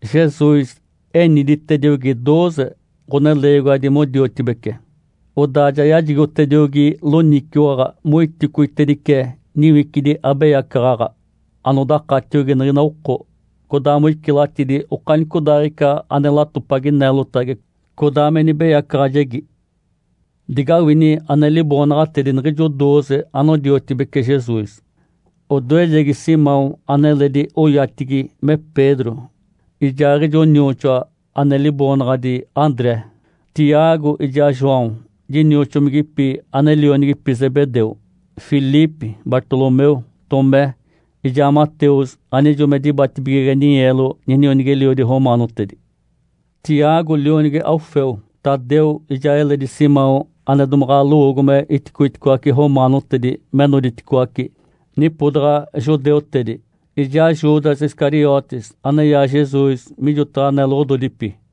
Jesus eniditediogi dooze ɡ̶oneleegiwadi modiotibece. Odaa ja yajigotediogi loniciwaɡ̶a moiticoitedice niwicidi abeyacaɡ̶aɡ̶a anodakatiogi niɡ̶ina oko, codaa moicilatidi okanicodaaɡ̶ica ane latopagi neelotagi codaa me nibeyacaɡ̶ajegi. Digawini ane liboonaɡ̶atedi niɡ̶ijo dooze anodiotibece Jesus: odoejegi Simão, aneledi oyatigi me Pedro, ijaaɡ̶ijo nioxoa ane liboonaɡ̶adi André; Tiago ijaa João dinioxomigipi ane lionigipi Zebedeu; Filipe, Bartolomeu, Tomé ijaa Mateus anijo me dibatibigege ninyeelo ninionigi-eliodi romaanotedi; Tiago lionigi Alfeu, Tadeu, ijaa eledi Simão ane domaɡ̶a lowoogo me iticoiticoace romaanotedi me noditicoaci nipodaɡ̶a judeutedi; ijaa Judas Iscariotes aneyaa Jesus mijotaɡ̶a neloɡ̶ododipi.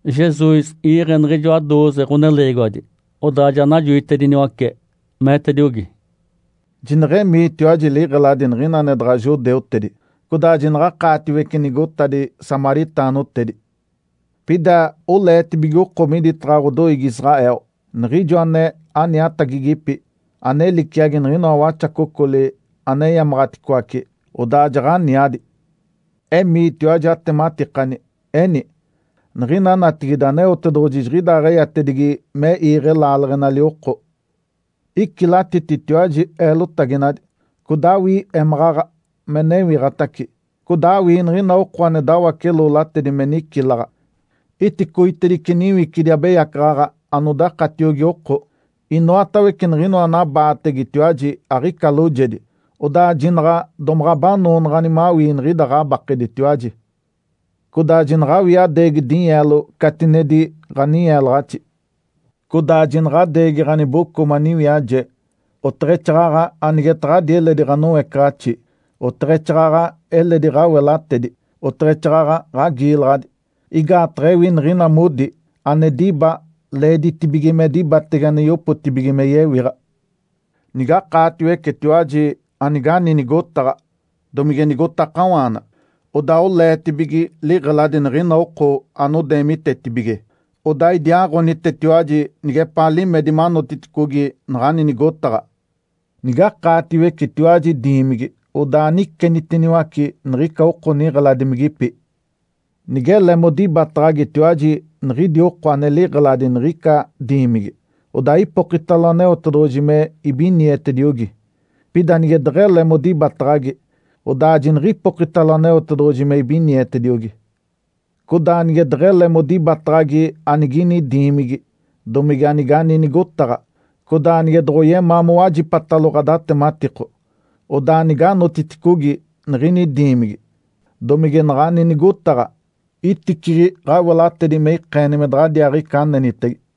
Jesus iiɡ̶e niɡ̶ijoa dooze ɡ̶oneleegiwadi, odaa ja najoitediniwace, meetediogi, “Jineɡ̶emiitiwaji liɡ̶eladi niɡ̶ina ane daɡ̶a judeutedi, codaa jinaɡ̶akaatiwece nigotadi samaritaanotedi. Pida oleetibige oko miditaɡ̶a ɡ̶odoiigi Israel, niɡ̶ijo ane aniatagigipi, ane liciagi niɡ̶inoa waxacocoli aneyamaɡ̶aticoace, odaa jaɡ̶aniadi. Emiitiwaji atematikani, eni, ‘Niɡ̶ina natigide Aneotedoɡ̶oji jiɡ̶idaaɡ̶eyatedigi me iiɡ̶e laaleɡ̶enali oko.’ Icilatititiwaji eelotaginadi, codaa awii émaɡ̶aɡ̶a me newiɡ̶atace. Codaa awii niɡ̶ina oko ane dawace-loolatedi me nicilaɡ̶a. Iticoitedice niwicidi abeyacaɡ̶aɡ̶a anodakatiogi oko. Inoatawece niɡ̶inoa anabaategetiwaji aɡ̶ica loojedi, odaa jinaɡ̶a domaɡ̶a abanoonaɡ̶ani mawii niɡ̶ida ɡ̶abakeditiwaji. Codaa jinaɡ̶awii adeegi dinyeelo catinedi ɡ̶aninyeelaɡ̶axi. Codaa jinaɡ̶adeegi ɡ̶aniboco maniwiaje, oteɡ̶exaaɡ̶aɡ̶a anigetaɡ̶ani eledi ɡ̶anoecaɡ̶axi, oteɡ̶exaaɡ̶aɡ̶a eletidi ɡ̶awelatedi, oteɡ̶exaaɡ̶aɡ̶a ɡ̶agiilaɡ̶adi. Igaataɡ̶a ewi niɡ̶ina modi, ane diba leeditibige me dibatege ane yopotibige me yewiɡ̶a. Nigakaatiwecetiwaji anigani nigotaɡ̶a domige nigotakawaana, odaa oleetibige liɡ̶eladi niɡ̶ina oko anodeemitetibige, odaa idiaaɡ̶onitetiwaji nigepaa limedi manotiticogi naɡ̶ani nigotaɡ̶a. Nigakaatiwecetiwaji diimigi, odaa anicenitiniwace niɡ̶ica oko niɡ̶eladimigipi. Nigele modibataɡ̶agitiwaji niɡ̶idi oko ane liɡ̶eladi niɡ̶ica diimigi, odaa ipokitalo Aneotedoɡ̶oji me ibinietediogi. Pida nige deɡ̶ele modibataɡ̶agi, odaa jiniɡ̶ipokitalo Aneotedoɡ̶oji me ibinietediogi. Codaa nige deɡ̶ele modibataɡ̶agi anigini diimigi, domige anigani nigotaɡ̶a, codaa nige doɡ̶oyemaa mowajipatalo ɡ̶adatematiko, odaa niganotiticogi niɡ̶ini diimigi, domige naɡ̶ani nigotaɡ̶a, iticiɡ̶i ɡ̶awelatedi me ikeeni me daɡ̶adiaaɡ̶ica anenitege.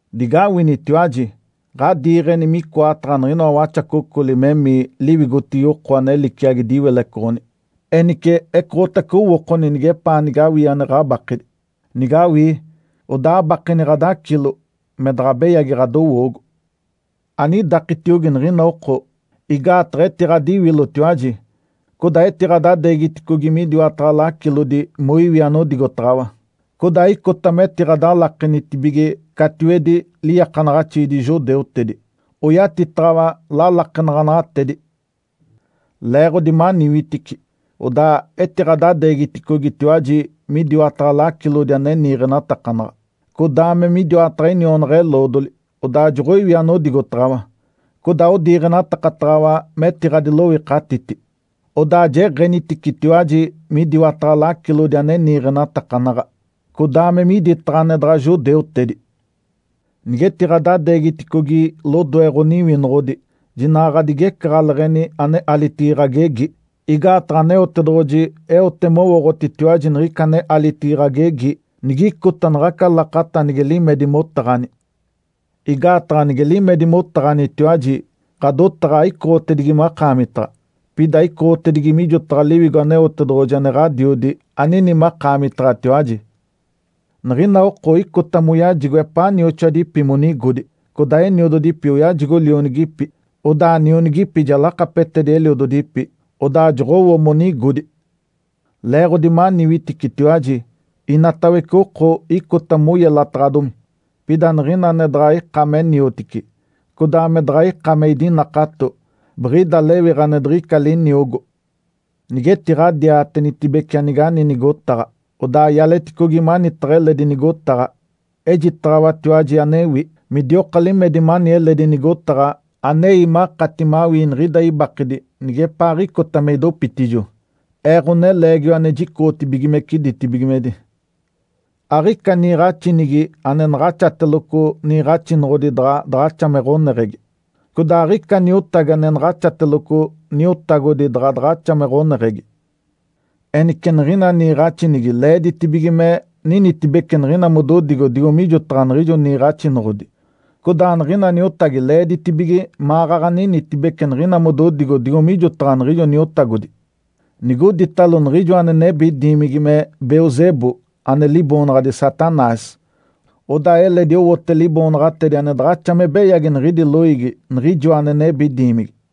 Digawinitiwaji! Ǥadiiɡ̶eni micoataɡ̶a niɡ̶inoa waxacocoli memii liwigotigi oko ane liciagi diwilecoɡ̶oni. Enice ecoɡ̶otace owookoni nigepaa nige awii ane ɡ̶abakedi. Nigawii, odaa abakeni ɡ̶adacilo, me daɡ̶a beyagi ɡ̶adowoogo. Anidakitiogi niɡ̶ina oko. Igaataɡ̶a etiɡ̶adiwilotiwaji codaa etiɡ̶adadeegiticogi midiwataɡ̶a lacilodi moiwi anodigotaɡ̶awa, codaa icota metiɡ̶adalakenitibige catiwedi liiakanaɡ̶axiidi judeutedi, oyatitaɡ̶awa lalakenaɡ̶anaɡ̶atedi. Leeɡ̶odi maniwitici, odaa etiɡ̶adadeegiticogitiwaji midiwataɡ̶a lacilodi ane niiɡ̶enatakanaɡ̶a, codaa me midiwataɡ̶a inionaɡ̶a-eloodoli, odaa joɡ̶oiwi anigotaɡ̶awa, codaa odiiɡ̶enatakataɡ̶awa metiɡ̶adiloikatiti. Odaa jeɡ̶eniticitiwaji midiwataɡ̶a lacilodi ane niiɡ̶enatakanaɡ̶a, codaa me miditaɡ̶a ane daɡ̶a judeutedi. Nigetiɡ̶adadeegiticogi lodoe ɡ̶oniwinoɡ̶odi, jinaɡ̶a ɡ̶adigecaɡ̶aleɡ̶eni ane alitigi ɡ̶agegi. Igaataɡ̶a Aneotedoɡ̶oji eote mowooɡ̶otitiwaji niɡ̶ica ane alitigi ɡ̶agegi nigicota naɡ̶aca lakata nige limedi motaɡ̶ani. Igaataɡ̶a nige limedi motaɡ̶anitiwaji, ɡ̶adotaɡ̶a aicoɡ̶otedigi makaamitaɡ̶a, pida icoɡ̶otedigi mijotaɡ̶a Liwigo Aneotedoɡ̶oji ane Ǥadiodi anini makaamitaɡ̶atiwaji. Niɡ̶ina oko icota moyajigo epaa nioxoadipi monigodi, codaa eniododipi oyajigo lionigipi, odaa nionigipi ja lakapetedi eliododipi, odaa joɡ̶owo monigodi. Leeɡ̶odi maniwiticitiwaji, inatawece oko icota moyelataɡ̶adomi. Pida niɡ̶ina ane daɡ̶a ika me niotici, codaa me daɡ̶a ika me idinakato, biɡ̶ida lewiɡ̶a ane diɡ̶ica liniogo. Nigetiɡ̶adiatenitibece anigani nigotaɡ̶a, odaa ialeticogi manitaɡ̶a eledi nigotaɡ̶a. Ejitaɡ̶awatiwaji anewi, midioka limedi mani eledi nigotaɡ̶a anei makati mawii niɡ̶ida ibakedi nigepaaɡ̶icota me idopitijo, Ee, Ǥoneleegiwa ane jicoɡ̶otibigimece ditibigimedi. Aɡ̶ica niiɡ̶axinigi ane naɡ̶axateloco niiɡ̶axinoɡ̶odi daɡ̶a daɡ̶axa me ɡ̶oneɡ̶egi. Codaa aɡ̶ica niotagi ane naɡ̶axateloco niotagodi daɡ̶a daɡ̶axa me ɡ̶oneɡ̶egi. Enice niɡ̶ina niiɡ̶axinigi leeditibige me ninitibece niɡ̶ina mododigo digo mijotaɡ̶a niɡ̶ijo niiɡ̶axinoɡ̶odi, codaa niɡ̶ina niotagi leeditibige maɡ̶aɡ̶a ninitibece niɡ̶ina mododigo digo mijotaɡ̶a niɡ̶ijo niotagodi. Nigoditalo niɡ̶ijoa ane nebi diimigi me Belzebu (ane liboonaɡ̶adi Satanás), odaa eledi owote liboonaɡ̶atedi ane daɡ̶axa me beyagi niɡ̶idi loiigi niɡ̶ijoa ane nebi diimigi.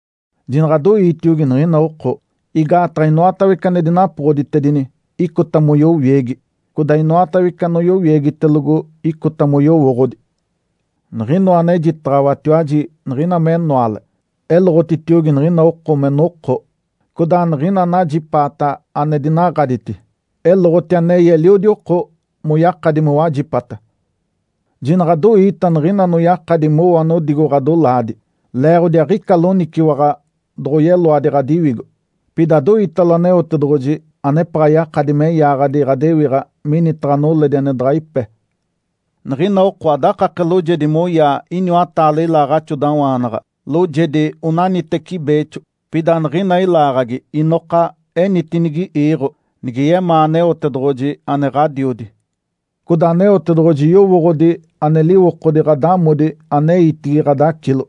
Jinaɡ̶adoiitiogi niɡ̶ina oko. Igaataɡ̶a inoatawece ane dinapoɡ̶oditedini icota moyowiegi, codaa inoatawece anoyowiegitelogo, icota moyowooɡ̶odi. Niɡ̶inoa anejitaɡ̶awatiwaji niɡ̶ina me enoale, eloɡ̶otitiogi niɡ̶ina oko me noko. Codaa niɡ̶ina anajipaata ane dinaɡ̶aditi, eloɡ̶oti anei eliodi oko moyakadi mowajipata. Jinaɡ̶adoiita niɡ̶ina anoyakadi mowo anodigo ɡ̶adolaadi, leeɡ̶odi aɡ̶ica loniciwaɡ̶a doɡ̶oyeloadi ɡ̶adiwigo. Pida adoiitalo Aneotedoɡ̶oji anepaɡ̶a yakadi me yaaɡ̶adi ɡ̶adewiɡ̶a minitaɡ̶a noledi ane daɡ̶a ipe. Niɡ̶ina oko adakake loojedi moyaa iniwataale ilaaɡ̶axodawaanaɡ̶a, loojedi onaniteci beexo. Pida niɡ̶ina ilaaɡ̶agi inoka enitinigi iiɡ̶o, nige yemaa Aneotedoɡ̶oji ane Ǥadiodi. Codaa Aneotedoɡ̶oji yowooɡ̶odi ane liwokodi ɡ̶adamodi aneitigi ɡ̶adacilo.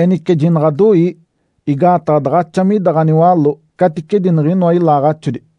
Enice jinaɡ̶adoii! Igaataɡ̶a daɡ̶axa mida ɡ̶aniwaló caticedi niɡ̶inoa ilaaɡ̶axodi.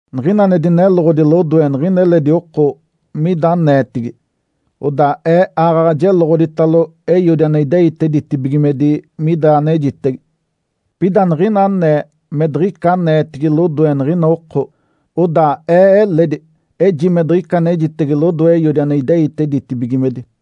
Niɡ̶ina ane dineloɡ̶odi lodoe niɡ̶ina eledi oko mida aneetigi, odaa Ee aaɡ̶aɡ̶a jeloɡ̶oditalo Eiodi ane ideite ditibigimedi mida anejitege. Pida niɡ̶ina anee me diɡ̶ica aneetigi lodoe niɡ̶ina oko, odaa Ee eledi eji me diɡ̶ica anejitege lodoe Eiodi ane ideite ditibigimedi.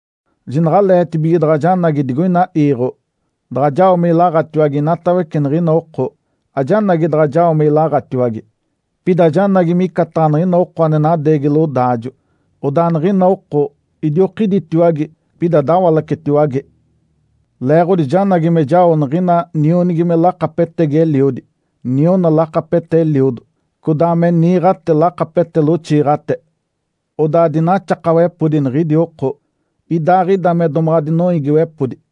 Jinaɡ̶aleetibige daɡ̶a janagi digoina iiɡ̶o daɡ̶a jao me ilaɡ̶atiwage inatawece niɡ̶ina oko. Ajanagi daɡ̶a jao me ilaɡ̶atiwage, pida janagi micataɡ̶a niɡ̶ina oko ane nadeegi lodaajo, odaa niɡ̶ina oko idiokiditiwage, pida dawalacetiwage. Leeɡ̶odi janagi me jao niɡ̶ina nionigi me lakapetegi eliodi, niona lakapete eliodo, codaa me niiɡ̶ate lakapete loxiiɡ̶ate. Odaa dinaxakawepodi niɡ̶idi oko, idaaɡ̶ida me domaɡ̶a dinoiigiwepodi.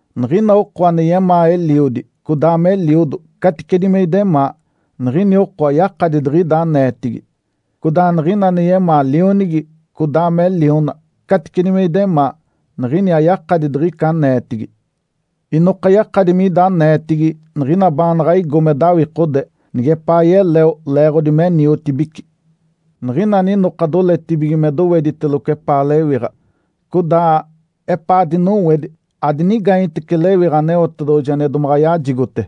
Niɡ̶ina oko ane yemaa eliodi codaa me eliodo caticedi me idemaa, niɡ̶ini oko ayakadi diɡ̶ida aneetigi, codaa niɡ̶ina ane yemaa lionigi codaa me liona caticedi me idemaa, niɡ̶ini ayakadi diɡ̶ica aneetigi. Inoka yakadi mida aneetigi niɡ̶ina baanaɡ̶a igo me dawikode nigepaa yeleo leeɡ̶odi me niotibici. Niɡ̶ina aninoka doletibige me dowediteloco epaa lewiɡ̶a, codaa epaa dinowedi adinigaanyetece lewiɡ̶a Aneotedoɡ̶oji ane domaɡ̶a yajigote.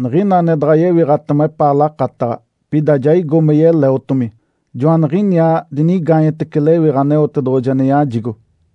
Niɡ̶ina ane daɡ̶a yewiɡ̶atema epaa lakataɡ̶a, pida ja igo me yeleotomi, joaniɡ̶iniaa dinigaanyetece lewiɡ̶a Aneotedoɡ̶oji ane yajigo.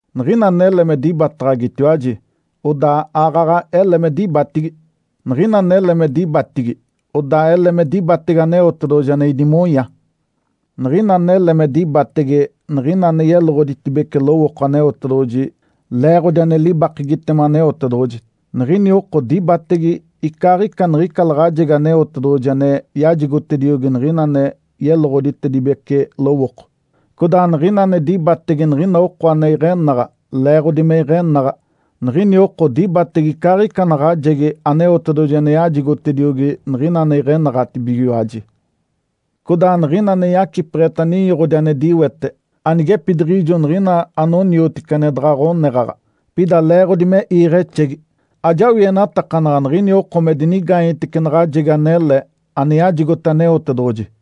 Niɡ̶ina anele me dibataɡ̶agitiwaji, odaa aaɡ̶aɡ̶a ele me dibatigi. Niɡ̶ina anele me dibatigi, odaa ele me dibatege Aneotedoɡ̶oji ane idimonya. Niɡ̶ina anele me dibatege niɡ̶ina ane yeloɡ̶oditedibece lowooko Aneotedoɡ̶oji leeɡ̶odi ane libakegitema Aneotedoɡ̶oji, niɡ̶ini oko dibatege icaaɡ̶ica niɡ̶ica laɡ̶ajegi Aneotedoɡ̶oji ane yajigotediogi niɡ̶ina ane yeloɡ̶oditedibece lowooko. Codaa niɡ̶ina ane dibatege niɡ̶ina oko ane iɡ̶enaɡ̶a leeɡ̶odi me iɡ̶enaɡ̶a, niɡ̶ini oko dibatege icaaɡ̶ica naɡ̶ajegi Aneotedoɡ̶oji ane yajigotediogi niɡ̶ina ane iɡ̶enaɡ̶atibigiwaji. Codaa niɡ̶ina ane yacipeɡ̶eta ninyoɡ̶odi ane diwete anigepidiɡ̶ijo niɡ̶ina anoniotici ane daɡ̶a ɡ̶oneɡ̶aɡ̶a, pida leeɡ̶odi me iiɡ̶exegi, ajawienatakanaɡ̶a niɡ̶ini oko me dinigaanyetece naɡ̶ajegi anele ane yajigote Aneotedoɡ̶oji.”